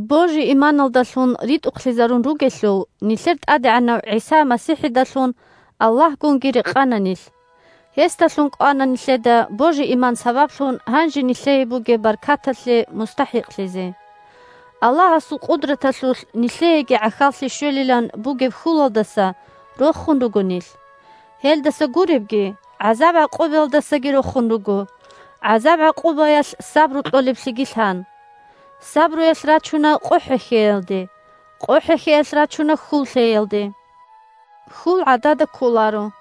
Божи-иманалдалъун ритӀухълъизарун ругелъул, нилъер ТӀадегӀанав ГӀиса МасихӀидалъун Аллагьгунги рекъана нилъ. Гьесдалъун кӀвана нилъеда божи-иман сабаблъун гьанже нилъее бугеб баркаталъе мустахӀикълъизе. Аллагьасул къудраталъулъ нилъееги гӀахьаллъи щвелилан бугеб хьулалдаса рохун руго нилъ. Гьелдаса гуребги, гӀазаб-гӀакъубаялдасаги рохун руго, гӀазаб-гӀакъубаялъ сабру кьолеблъиги лъан. Сабруялъ рачуна къо хӀехьеялде, къо хӀехьеялъ рачуна хьул лъеялде, хьул гӀадада кколаро –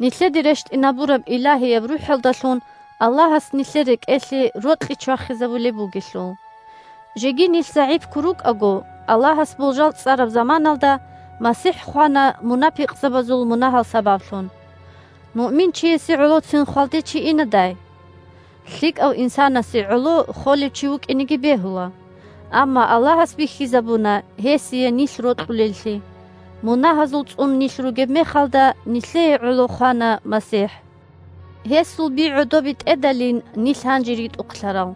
нилъеде рещтӀинабураб Илагьияб РухӀалдалъун Аллагьас нилъер рекӀелъе рокьи чвахизабулеб бугелъул. Жеги нилъ загӀипго рукӀаго, Аллагьас болжал цӀараб заманалда, МасихӀ хвана мунапикъзабазул мунагьал сабаблъун. Муъминчиясе гӀолоцин хвалде чи инадай? ЛъикӀав инсанасе гӀоло холев чи вукӀинеги бегьула. Амма Аллагьас бихьизабуна гьесие нилъ рокьулеллъи: мунагьазул цӀун нилъ ругеб мехалда, нилъее гӀоло хвана МасихӀ. Гьесул би гӀодобе тӀедалин нилъ гьанже ритӀухълъарал.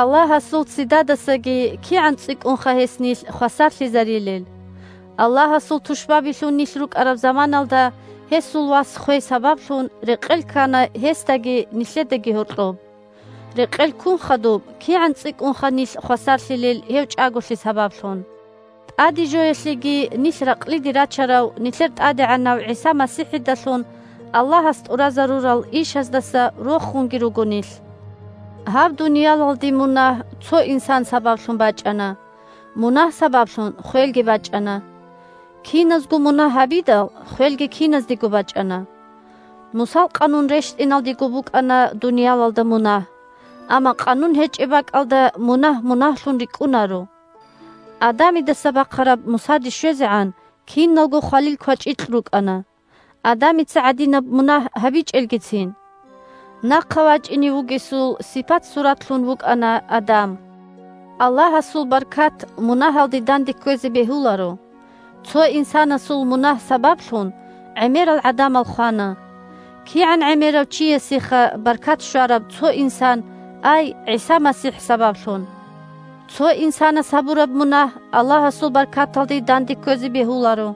Аллагьасул ццидадасаги кигӀан цӀикӀкӀунха гьес нилъ хвасарлъизарилел! Аллагьасул тушбабилъун нилъ рукӀараб заманалда, гьесул Вас хвей сабаблъун, рекъел ккана гьесдаги нилъедаги гьоркьоб. Рекъел ккун хадуб кигӀан цӀикӀкӀунха нилъ хвасарлъилел гьев чӀаголъи сабаблъун. ТӀадежоялъеги нилъ ракълиде рачарав нилъер ТӀадегӀанав ГӀиса МасихӀидалъун Аллагьас тӀуразарурал ишаздаса рохунги руго нилъ. Гьаб дуниялалде мунагь цо инсан сабаблъун бачӀана, мунагь сабаблъун хвелги бачӀана. Киназго мунагь гьабидал, хвелги киназдего бачӀана. Мусал Къанун рещтӀиналдего букӀана дуниялалда мунагь. Амма Къанун гьечӀеб бакӀалда мунагь мунагьлъун рикӀкӀунаро. Адамидаса бахъараб Мусаде щвезегӀан киналго хвалил квачӀикь рукӀана, Адамица гӀадинаб мунагь гьабичӀелгицин. Нахъа вачӀине вугесул сипат-суратлъун вукӀана Адам. Аллагьасул баркат мунагьалде данде кквезе бегьуларо. Цо инсанасул мунагь сабаблъун гӀемерал гӀадамал хвана. КигӀан гӀемерав чиясеха баркат щвараб цо инсан, ай ГӀиса МасихӀ сабаблъун. Цо инсанас гьабураб мунагь Аллагьасул баркаталде данде кквезе бегьуларо.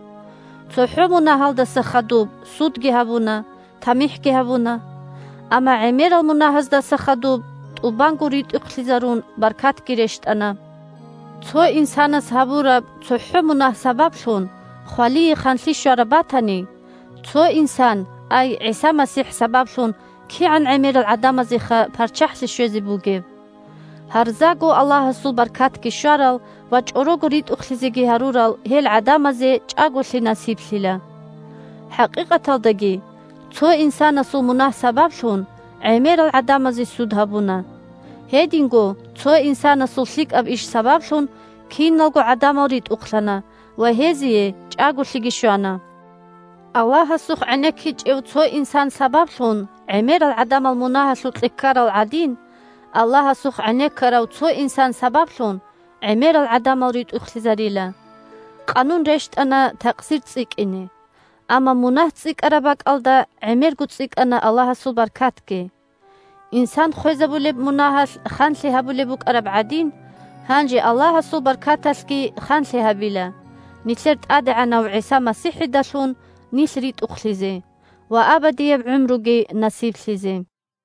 ЦохӀо мунагьалдаса хадуб судги гьабуна, тамихӀги гьабуна. Амма гӀемерал мунагьазда хадуб, тӀубанго ритӀухълъизарун, баркатги рещтӀана. Цо инсанас гьабураб цохӀо мунагь сабаблъун хвалие ханлъи щвараб батани, цо инсан, ай ГӀиса МасихӀ сабаблъун кигӀан гӀемерал гӀадамазеха парччахӀлъи щвезе бугеб! Гьарзаго Аллагьасул баркатги щварал ва чӀорого ритӀухълъизеги гьарурал гьел гӀадамазе чӀаголъи насиблъила. ХӀакъикъаталдаги, цо инсанасул мунагь сабаблъун, гӀемерал гӀадамазе суд гьабуна. Гьединго, цо инсанасул лъикӀаб иш сабаблъун, киналго гӀадамал ритӀухълъана ва гьезие чӀаголъиги щвана. Аллагьасухъ гӀенеккичӀев цо инсан сабаблъун гӀемерал гӀадамал мунагьалъукье ккарал гӀадин, Аллагьасухъ гӀенеккарав цо инсан сабаблъун гӀемерал гӀадамал ритӀухълъизарила. Къанун рещтӀана такъсир цӀикӀкӀине. Амма мунагь цӀикӀкӀараб бакӀалда гӀемерго цӀикӀкӀана Аллагьасул баркатги. Инсан хвезавулеб мунагьалъ ханлъи гьабулеб букӀараб гӀадин, гьанже Аллагьасул баркаталъги ханлъи гьабила, нилъер ТӀадегӀанав ГӀиса МасихӀидалъун нилъ ритӀухълъизе ва абадияб гӀумруги насиблъизе.